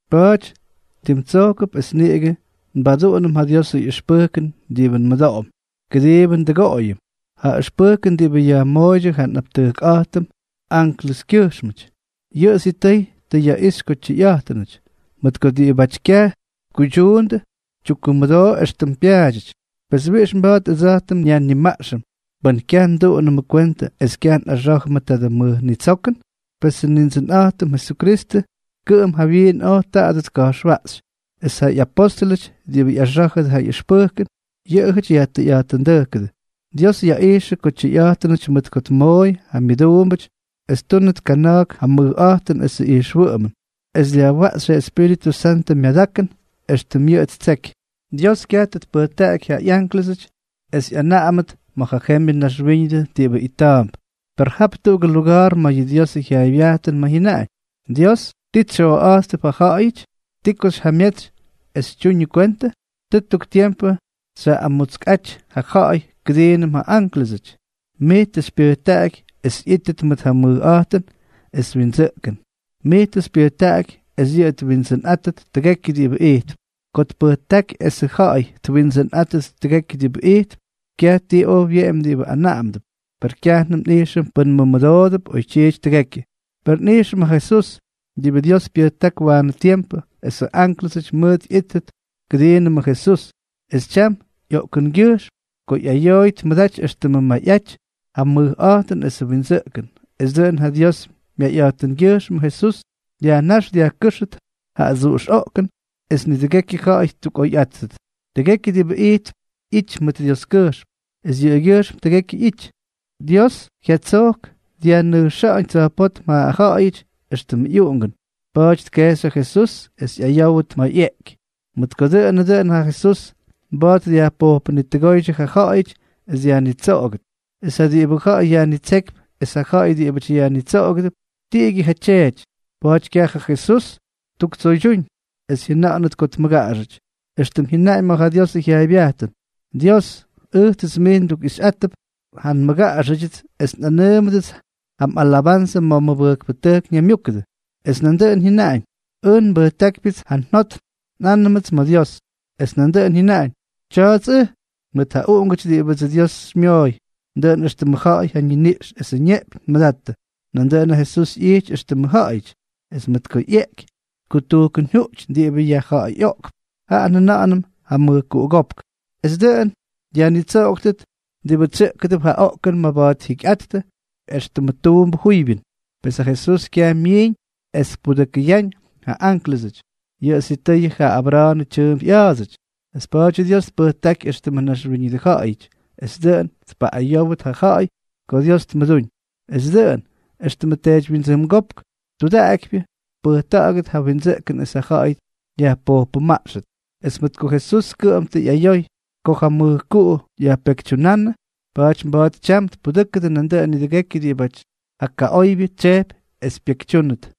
Pa̱a̱ty, tim tsojkʉp es niꞌigʉ nbaduꞌunʉm ja Diosʉ ꞌyʉxpʉjkʉn diꞌibʉ nmʉdoꞌom, kʉdiibʉ ndʉgoꞌoyʉm. Ja ʉxpʉjkʉn diꞌibʉ yajmooydyʉ ja nꞌaptʉjkꞌa̱jtʉm anklʉskyʉjxmʉty, yʉꞌʉ sitʉy tʉ yaꞌixy ko tyʉyꞌa̱jtʉnʉty, mʉt ko diꞌibáty kyaj tkuydyuundʉ, tyukkumʉdoo éxtʉm pyaadyʉty. Pes, ¿wiꞌix mba̱a̱t ʉdsa̱jtʉm nyajnimaꞌxʉm pʉn kyaj nduꞌunʉmʉ kwentʉ es kyaj nꞌaxá̱jʉmʉ tadʉ mʉj nitsokʉn? Pesʉ Nindsʉnꞌa̱jtʉm Jesukristʉ kʉꞌʉm jawyiin oj tadʉ tka̱jxwaꞌxy, es ja ꞌyapóstʉlʉty diꞌibʉ ꞌyaxá̱jʉdʉ ja ꞌyʉxpʉjkʉn, yʉꞌʉjʉty yajtʉyꞌa̱jtʉndʉjkʉdʉ. Dios yaꞌijxʉ ko tyʉyꞌa̱jtʉnʉty mʉt ko tmooy ja myʉduumbʉty es ttúnʉt kana̱a̱k ja mʉjꞌa̱jtʉn esʉ ijxwʉꞌʉmʉn, es dyajwaꞌxy ja Espíritʉ Santʉ myadakʉn éxtʉm yʉꞌʉ ttsejky. Dios kyaj tʉ tpʉjtaꞌaky ja ꞌyánklʉsʉty es ꞌyanaꞌamʉt ma̱ yʉ jembyʉ naxwíñʉdʉ diꞌibʉ ita̱a̱mp. Per jap tuꞌugʉ luga̱a̱r ma̱ yʉ Diosʉ jyaaybyajtʉn ma̱ jyʉnaꞌañ: Dios, ¿ti tsyoꞌa̱jttʉp ja ja̱ꞌa̱yʉty, ti ko xyjamyetsy es xytyuñʉ kwentʉ? Tʉ tuk tiempʉ xyaꞌꞌamutskꞌaty ja ja̱ꞌa̱y kʉdiinʉm ja ánklʉsʉty; mij tʉ xypyʉjtaꞌaky es ꞌyíttʉt mʉt ja mʉjꞌa̱jtʉn esʉ windsʉꞌkʉn, mij tʉ xypyʉjtaꞌaky es yʉꞌʉ tniwindsʉnꞌátʉt tʉgekyʉ diꞌibʉ ijtp. Ko tpʉjtáky esʉ ja̱ꞌa̱y twindsʉnꞌáttʉt tʉgekyʉ diꞌibʉ ijtp, kyaj ti oj wyeꞌemy diꞌibʉ anaꞌamʉdʉp. Per kyajnʉm nꞌijxʉm pʉ́n mʉmʉdoop oytyiity tʉgekyʉ. Per nꞌijxʉm ja Jesús, diꞌibʉ Dios pyʉjták waanʉ tiempʉ esʉ ánklʉsʉty mʉj ꞌyíttʉt kʉdiinʉmʉ Jesús, es tyam ꞌyoꞌkʉngyʉjxm ko ꞌyayooy tmʉdaty éxtʉmʉ mayꞌaty ja mʉjꞌa̱jtʉn esʉ windsʉꞌkʉn, es dʉꞌʉn ja Dios myayꞌa̱jtʉngyʉjxmʉ Jesús dyajnáx dyajkʉ́xʉt ja adsuꞌux oꞌkʉn es nidʉgekyʉ ja̱ꞌa̱y ttukꞌoyꞌáttʉt. Tʉgekyʉ diꞌibʉ ijtp ꞌyity mʉt Dioskyʉjxm, es yʉꞌʉgyʉjxm tʉgekyʉ ꞌyity. Dios jyatsojk dyajnʉjxa̱ꞌa̱ñ tsa̱jpótm ja ja̱ꞌa̱yʉty éxtʉmʉ ꞌyuꞌungʉn, pa̱a̱ty tkejxy ja Jesús es ꞌyayówʉt ma̱ ꞌyeꞌky, mʉt ko dʉꞌʉnʉ dʉn ja Jesús mba̱a̱t dyajpojpʉnitʉgóydyʉ ja ja̱ꞌa̱yʉty es dyajnitsoꞌogʉt. Es ja diꞌibʉ ja̱ꞌa̱y yajnitsékypy es ja ja̱ꞌa̱y diꞌibʉty yajnitsoꞌogʉdʉp, tiꞌigyʉ ja Tyeety. Pa̱a̱ty kyaj ja Jesús ttuktsoydyúñ es jyʉna̱ꞌa̱nʉt ko tmʉgaꞌaxʉty, éxtʉm jyʉnaꞌañ ma̱ ja Diosʉ jyaaybyajtʉn: Dios, ʉjtsʉts mij ndukꞌixyꞌátʉp ja nmʉgaꞌaxʉdyʉts, es nꞌʉ́wʉdʉts ja mꞌalabanzʉ ma̱ mʉbʉjkpʉtʉjk ñaymyúkʉdʉ. Es nandʉꞌʉn jyʉnaꞌañ: Ʉj nbʉjtákypyʉts ja njot nꞌánʉmʉts ma̱ Dios. Es nandʉꞌʉn jyʉnaꞌañ: Tya̱a̱ts ʉj, mʉt ja uꞌungʉty diꞌibʉdsʉ Dios xymyooy. Dʉꞌʉn éxtʉmʉ ja̱ꞌa̱y ja niniꞌx esʉ neꞌpyñ tmʉdattʉ, nandʉꞌʉn ja Jesús ꞌyijty éxtʉmʉ ja̱ꞌa̱yʉty, es mʉt ko ꞌyeꞌky tkutujkʉnjuꞌty diꞌibʉ yajja̱ꞌa̱yꞌoꞌkp, jaꞌa njʉna̱ꞌa̱nʉm ja mʉjkuꞌugópk, es dʉꞌʉn dyajnitsoꞌoktʉt diꞌibʉ tsyʉꞌkʉdʉp ja oꞌkʉn maba̱a̱t jyikyꞌattʉ éxtʉmʉ tuumbʉ juybyʉn. Pes ja Jesús kyaj myiiñ es tpudʉkʉyáñ ja ánklʉsʉty, yʉꞌʉ sitʉyʉ ja Abra̱a̱nʉ tyʉʉmp ꞌya̱a̱dsʉty. Es pa̱a̱dyʉ Dios tpʉjtáky éxtʉmʉ naxwíñʉdʉ ja̱ꞌa̱yʉty es dʉꞌʉn tpaꞌꞌayówʉt ja ja̱ꞌa̱y ko Dios tmʉdúñ, es dʉꞌʉn, éxtʉmʉ teedywyindsʉngópk tudaꞌakypyʉ, tpʉjta̱ꞌa̱gʉt ja windsʉꞌkʉn es ja ja̱ꞌa̱y yajpojpʉmaꞌxʉt. Es mʉt ko Jesús kʉꞌʉm tʉ ꞌyayoy ko ja mʉjkuꞌu jyayajpekytyunánʉ, pa̱a̱ty mba̱a̱t tyam tpudʉ́kʉdʉ nandʉꞌʉn nidʉgekyʉ diꞌibáty ja kaꞌoybyʉ tsyejpy es pyekytyúnʉt.